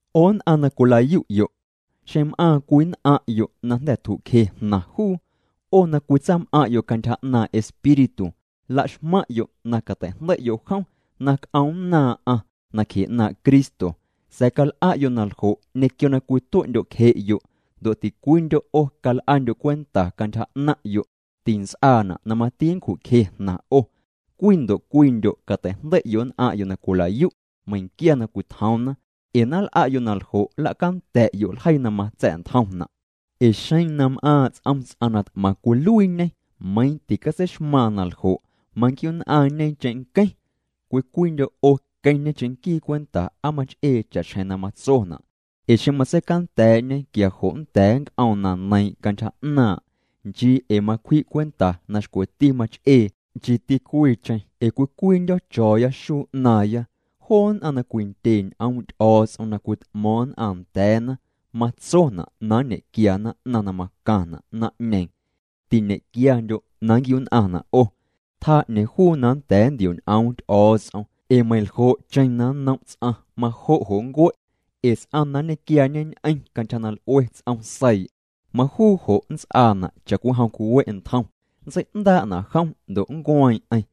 'O nn'aⁿ na cwila'yu'yo', xeⁿ m'aaⁿ cwii nn'aⁿ'yo' na jnda̱ tju'cje jnaⁿ juu, 'o na cwitsam'aⁿ'yo' cantyja 'naaⁿ' Espíritu, laxmaⁿ'yo' na cateijndei'yo' jom na c'oomnnaaⁿ'aⁿ nacje 'naaⁿ' Cristo, sa̱a̱ cal'a'yo' naljo' ñequio na cwitue'ndyo'cje'yo'. Ndo' ticwiindyo' 'o cal'andyo' cwenta cantyja 'naⁿ'yo', tints'aana' na mati nncju'cje jnaⁿ 'o. Cwii ndo' cwiindyo' catei'jndei'yo' nn'aⁿ'yo' na cwila'yu' meiⁿquia na cwitjoomna, ee na nl'a'yo' naljo' nla'canda̱'yo' ljeii na matsa̱'ntjomna'. Ee xeⁿ na m'aaⁿ' ts'om ts'aⁿ na t'maⁿ cwiluiiñê meiiⁿ ticatseixmaaⁿ na ljo', manquiu'nn'aⁿñe cheⁿnqueⁿ. Cwii cwiindyo' 'o queⁿñe cheⁿnquii cwenta aa mach'ee cha'xjeⁿ na matsona', ee xeⁿ matseicanda̱a̱'ñe quia jo' nnda̱a̱ nnc'oom na neiiⁿ' cantyja 'naaⁿ', nchii ee macwji' cwenta na xcweti mach'ee, nchiiti cwiicheⁿ, ee cwii cwiindyo̱ cho̱o̱ya xuu 'naaⁿya. Joo nn'aⁿ na cwindye ñ'oom' Ty'o̱o̱ts'om na cwit'mo̱o̱ⁿ nn'aⁿ nda̱a̱na, matsona' nñequiana 'naⁿ na macaⁿna' naⁿ'ñeeⁿ. Tiñe'quiandyo' na nnquiu'nn'aⁿna' 'o, tjaa 'ñeeⁿ juu na nda̱a̱ ntioñ'oom Ty'o̱o̱ts'om, ee meiⁿljo'cheⁿ na nnom' ts'aⁿ, majo' jo' nncue'. Ee ts'aⁿ na nñequiaañeñ'eⁿ cantyja na l'ue ts'om seii', majuu jo' nnts'aana' cha'cwijom cwiwe' ntjom, nntsei'ndaa'na jom ndo' nncueeⁿ'eⁿ.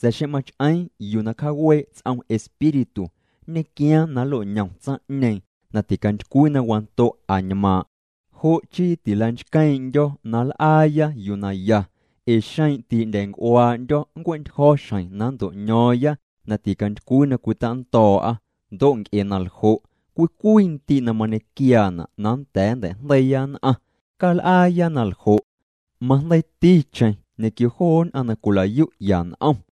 Sa̱a̱ xeⁿ mach'eeⁿ yuu na cjawee' ts'om Espíritu, nñequiaaⁿ na nnlo'ñom tsaⁿ'ñeeⁿ na ticantycwii na wando' añmaaⁿ'. Jo' chii tilanchqueeⁿ'ndyo̱ na nl'aaya yuu naya ee xeⁿ ti'ndya̱a̱nc'uaa'ndyo̱, nncue'ntyjo̱ xjeⁿ na nnto'ño̱o̱ⁿya na ticantycwii na cwitando̱o̱'a. Ndo' nc'e na ljo', cwii cwii ndii' na mañequiaana' na nnda̱a̱ nntei'jndeiiya nn'aⁿ, cal'aaya na ljo', majndeiiticheⁿ joo nn'aⁿ na cwila'yu'ya n'om.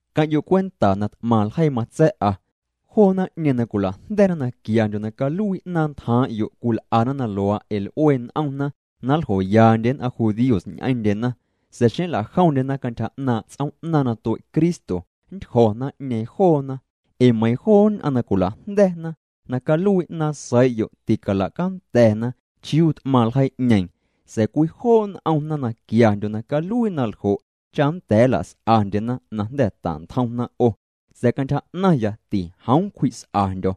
Queⁿ'yo' cwenta na t'maⁿ ljeii matsa̱'a. Joo naⁿ'ñeeⁿ na cwila'jnda̱na na quiandyo' na caluii 'naaⁿ ntjaaⁿ'yo' cwil'ana na luaa' ee l'ue n'omna na ljoyaandye nn'aⁿ judíos ñ'eⁿndyena sa̱a̱ xeⁿ nla'jomndyena cantyja 'naaⁿ' ts'oom'naaⁿ na tue' Cristo, nntyjo̱ naⁿ'ñeeⁿ joona. Ee meiiⁿ joo nn'aⁿ na cwila'jnda̱na na caluii 'naaⁿ seii'yo' ticalacanda̱na chiuu t'maⁿ ljeii'ñeeⁿ. Sa̱a̱ cwijoo' n'omna na quiandyo' na caluii naljo' cha nnda̱a̱ nla's'andye na jnda̱ tantjomna 'o. Sa̱a̱ cantyja 'naⁿya, tijoom cwji's'andyo̱.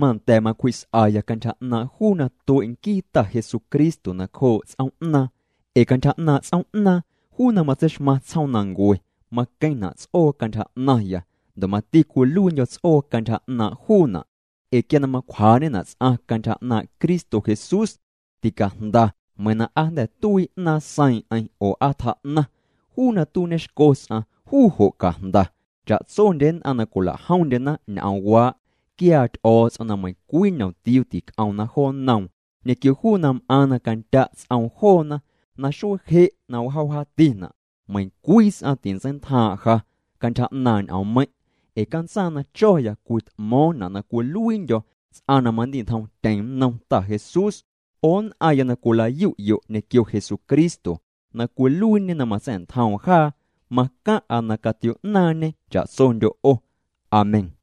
Manda̱ macwjii's'aya cantyja 'naaⁿ' juu na tue' nquii Ta Jesucristo nacjoo' ts'oom'naaⁿ, ee cantyja 'naaⁿ' ts'oom'naaⁿ, juu na matseixmaⁿ tsjoomnancue, maqueⁿna' ts'oo cantyja 'naⁿya ndo' mati cwiluiindyo̱ ts'oo cantyja 'naaⁿ' juuna'. Ee quia na macwjaa'ñena' ts'aⁿ cantyja 'naaⁿ' Cristo Jesús, ticajnda meiiⁿ na aa jnda̱ tuii 'naaⁿ seiiⁿ'eⁿ oo aa tjaa'naⁿ. Juu na tuiiñexco ts'aⁿ, juu jo' cajnda. Cha'tsondye nn'aⁿ na cwilajomndyena ñ'oomwaa', quiaa Ty'o̱o̱ts'om na meiⁿcwii ñomtiuu tic'omna jo nnoom ñequio juu na m'aaⁿ na candya' ts'oom joona. Na xuee je' na wjaa wjaatina', meiⁿcwii ts'aⁿ tintseintjaaⁿ' ja cantyja 'naaⁿ' ñ'oommeiⁿ'. Ee cantsaaⁿ na cho̱ya cwit'mo̱o̱ⁿna' na cwiluiindyo̱ ts'aⁿ na mandi'ntjomtyeⁿ nnom Ta Jesús. 'O nn'aⁿya na cwila'yu'yo' ñequio Jesucristo na cwiluiiñê na matsa̱'ntjoom jaa, macaⁿ'a na catio'naaⁿñê cha'tsondyo' 'o. Amén.